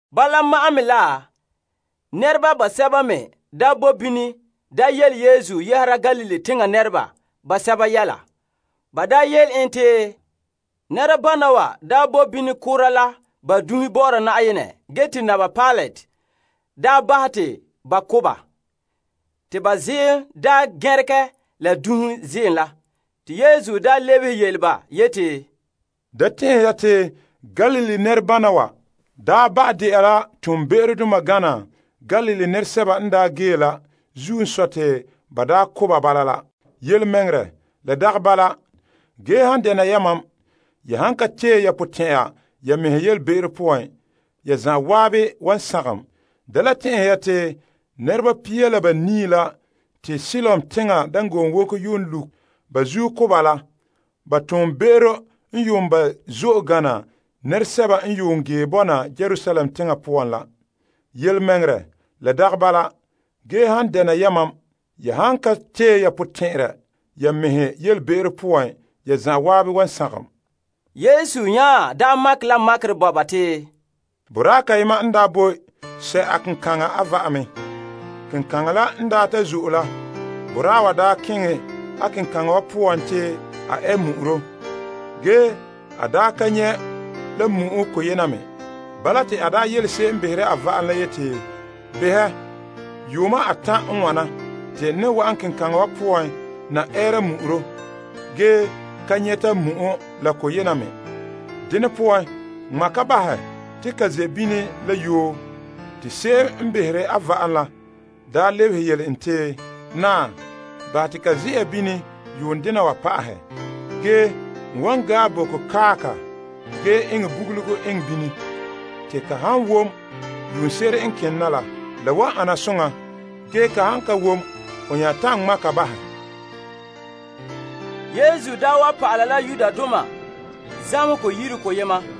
Bala ma'an me la nɛreba basɛba me daa boe bini daa yele Yesu yɛhera Galilee teŋa nɛreba basɛba yɛla. Ba yele en te nɛrebana wa bo bini koora la ba dunhe bɔ'ɔra Na'ayenɛ ge te Naba Pilate bahɛ te ba ko' ba. Te ba ziim gɛnregɛ la dunhe ziim la. Te Yesu lebehe yele ba yeti, Da tɛn'ɛhe ya te Galilee nɛrebana wa ba' de'a la toonbe'erodoma gana Galilee nɛresɛba n gee la zuo n sɔe te ba ko' ba la. Yelemɛŋɛrɛ, la dagɛ bala. Ge han dɛna yamam ya han ka tee ya potɛn'ɛra ya mɛhe ya yelebe'ero poan, ya zan'an wan sagom. Da le tɛn'ɛhe ya te nɛreba pia la banii la n yuun ki' la te Siloam teŋa dangoonwoko wogɛ yuun lu' ba zuo na ko' ba la toonbe'ero yuun ba' zo'e mɛ gana nɛresɛba n yuun ge bɔna Yerusalem teŋa poan la. Yelemɛŋɛrɛ, la dagɛ bala. Ge han dena ya mam, ya han ka tee ya potɛn'ɛrɛ ya mɛhe ya yelebe'ero poan, ya zan'an wan sagom. Yesu n nya makɛ la makerɛ bo ba te, Boraa kayema n daa boe sɛ' a kenkaŋa a va'am me. Kenkaŋa la n ta zo'e la, boraa wa keŋɛ a kenkaŋa wa poan te a ɛ mu'uro. Ge a ka nyɛ' la mu'o koyema me. Bala te a yele se'em n behere a va'am la yeti, behɛ, yuuma atan' n wana te n ne wa'an kenkaŋa wa poan na ɛɛra mu'uro. Ge n ka nyɛte mu'o la koyena me. Dene poan ŋma' ka bahɛ te ka ze' bini la yoo. Te se'em n behere a va'am la lebehe yele en te, naa, bahɛ te ka ze'a bini yuun dena wa pa'ahɛ. Ge n wan gae boko kae ka ge eŋɛ bugulugo eŋɛ bini. Te ka han wom yuunse'ere n kene na la, la wan ane soŋa. Ge ka han ka wom ho nya ta'an ŋma' ka bahɛ. Vo'ohogo Daarɛ Yesu daa wa pa'ala la zamehegɔ yire koyema.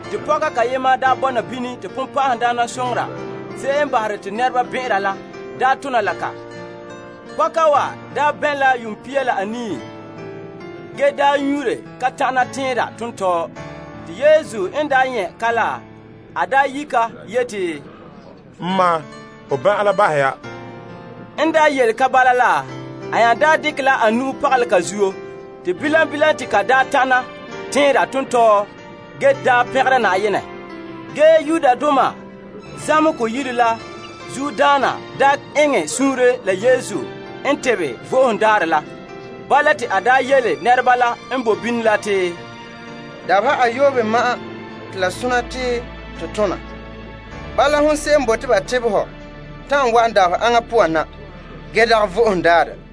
Te pɔka kayema bɔna bini te bonbe'a se'em n bahere te nɛreba bɛn'ɛnra la tona la ka. Pɔka wa bɛn' la yuun pia la anii ge nyuunre ka ta'ana tɛnra tontɔɔ. Te Yesu n nyɛ' ka la, a yi' ka yeti, N ma, ho ban'an la bahɛ ya. En yele ka bala la, a nya dekɛ la a nu'uhen pagalɛ ka zuo. Te bilam bilam te ka daa tana tɛnra tontɔɔ ge daa pɛngɛ Na'ayenɛ. Ge zamehegɔ yire la zuodaana daa eŋɛ suunre la Yesu n tebɛ Vo'ohogo Daarɛ la. Bala te a yele nɛreba la n boe bini la te, Dabeha ayoobe ma'an te la sona te to tona. Bala hon se'em n bote ba tebɛ hɔ ta'an wa'an dabeha aŋa poan na, ge dagɛ Vo'ohogo Daarɛ.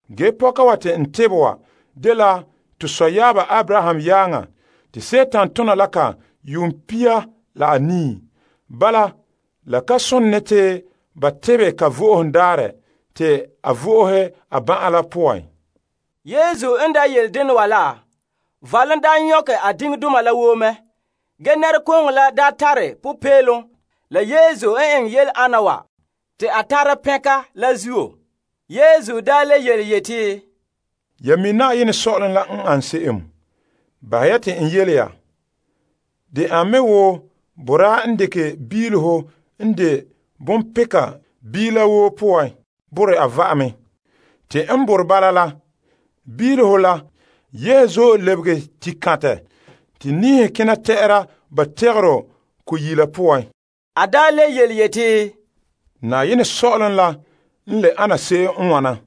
Ge pɔka wa te n tebɛ wa dela to sɔyaaba Abraham yaaŋa te Dima tona la ka yuun pia la anii. Bala la ka sone te n tebɛ ka Vo'ohogo Daarɛ te a vo'ohe a ban'an la poan? Yesu n yele dena wa la, valom daa nyɔkɛ a diŋdoma la woo mɛ. Ge nɛrekooŋɔ la tare popeelom la Yesu n eŋɛ yele ana wa te a tare pɛnka la zuo. Yesu nya le yeti, Ya mi' Na'ayenɛ Sɔ'ɔlom n ane se'em? Bahɛ ya te n yele ya. De an me wo boraa n dekɛ biileho n de bonpeka biila woo poan borɛ a va'am me. Te n borɛ n bala la, biileho la yehe zo'e lebege tikantɛ te niihe kena tɛ'ɛra ba togoro ko yila poan. A le yeti, Na'ayenɛ Sɔ'ɔlom la n le ana se'em n wana: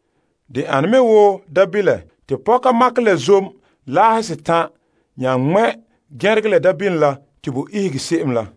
de ane me wo mi'ihom. Te pɔka makɛ la zom laahe setan' nya ŋmɛ' gɛregɛ la mi'ihom la te bo ihege se'em la.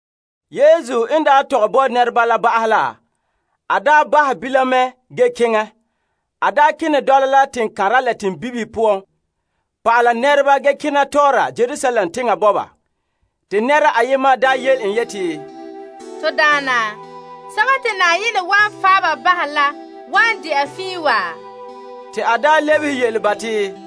Yesu n daa tɔgɛ bo nɛreba la ba'ahɛ la, a bahɛ bilam mɛ ge keŋɛ. A kene dɔla la teŋkanra la teŋbibihe poan pa'ala nɛreba ge kena tɔɔra Yerusalem teŋa bɔba. Te nɛra ayema soke en yeti, To Daana, sɛba te Na'ayenɛ wan fan' bahɛ la wan de'a fiin wa? Te a lebehe yele ba te,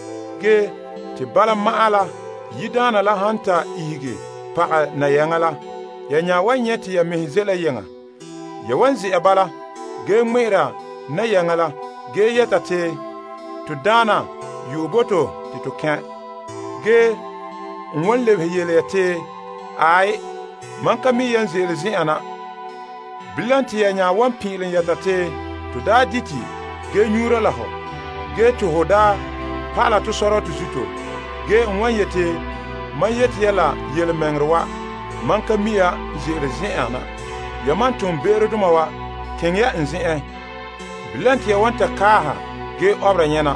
Ge te bala ma'an la yiredaana la han ta ihege pagɛ nayaŋa la, ya nya wan nyɛ' te ya mɛhe ze' la yeŋa. Ya wan ze'a bala ge ŋmɛ'ɛra nayaŋa la ge yɛta te, To Daana yu'ɛ bo to te to kɛn'. Ge n wan lebehe yele ya te, Aai, mam ka mi' yan ze'ele zen'en na. Bilam te ya nya wan pin'ilom yɛta te, To dite ge nyuura la hɔ ge te ho daa pa'ala tɔ sɔrɔtɔ zuto. Ge a wan yeti, Mam yete ya la yelemɛŋɛrɛ wa. Mam ka mi' yan ze'ele zen'en na. Yamam toonbe'erodoma wa, keŋɛ ya n zen'en. Bilam, te ya wan kaahɛ ge obe ya nyɛna.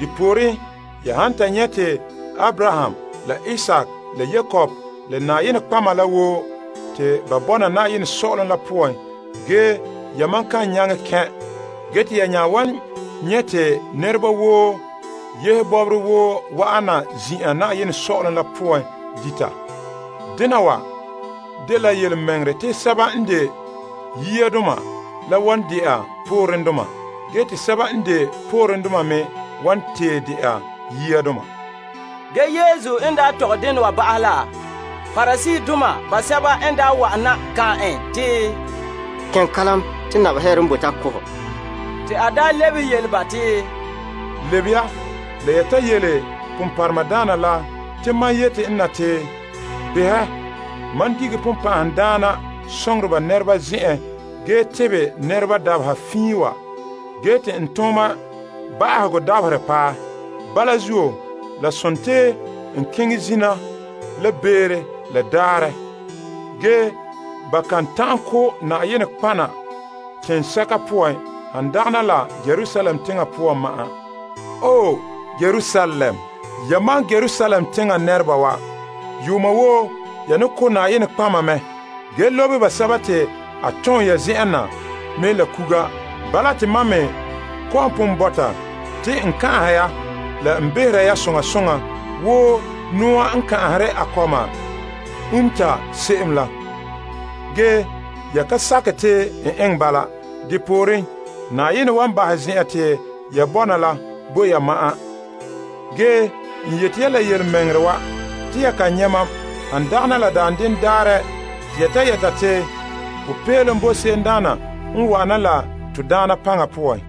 Depooren ya han ta nyɛ' te Abraham, la Isaak, la Yakob la nɔtɔgɔheba la woo te ba bɔna Na'ayenɛ Sɔ'ɔlom la poan, ge yamam kan nyaŋɛ kɛn'. Ge te ya nya wan nyɛ' te nɛreba woo yehe bɔbɔre woo wa'an na zin'an Na'ayenɛ Sɔ'ɔlom la poan dita. Dena wa dela yelemɛŋɛrɛ te sɛba n de yiadoma la wan de'a poorendoma ge te sɛba n de poorendoma me wan tee de'a yiadoma. Ge Yesu n daa tɔgɛ dena wa ba'ahɛ la, Pariseedoma basɛba n wa'an na kan'an en te, Keŋɛ kalam te Naba Herod n bote a ko' hɔ. Te a lebehe yele ba te, Lebe ya la ya ta yele peenhɔ la te mam n yete en na te, behɛ mam dige bonbɛ'ɛhe nɛreba zen'enhe ge tebɛ nɛreba dabeha fiin wa, ge te n tooma ba'ahegɔ dabaherɛ paɛ. Bala zuo, la sontii n kena zina la beere la daarɛ. Ge ba kan ta'an ko' nɔtɔgɔheba teŋsɛka poan han dagana la Yerusalem teŋa poan ma'an. Wae! Yamam Yerusalem teŋa nɛreba wa, yuuma woo ya ne ko' nɔtɔgɔheba mɛ ge lobe basɛba te a tom ya zen'en na me la kuga. Bala, te mam me kɔ'ɔn pon bɔta te n kan'anhe ya la n behera ya soŋa soŋa wo noa n kan'anhere a kɔma umta se'em la. Ge ya ka sakɛ te n eŋɛ bala. Depooren, Na'ayenɛ wan bahɛ zen'an te ya bɔna la bo ya ya ma'an. Ge n yete ya la yelemɛŋɛrɛ wa. Te ya kan nyɛ' mam han dagana la daanden daarɛ te ya ta yɛta, Kan'somɔ boe mɛ la se'em n dekɛ Na'ayenɛ yu'urɛ la wa'ana la.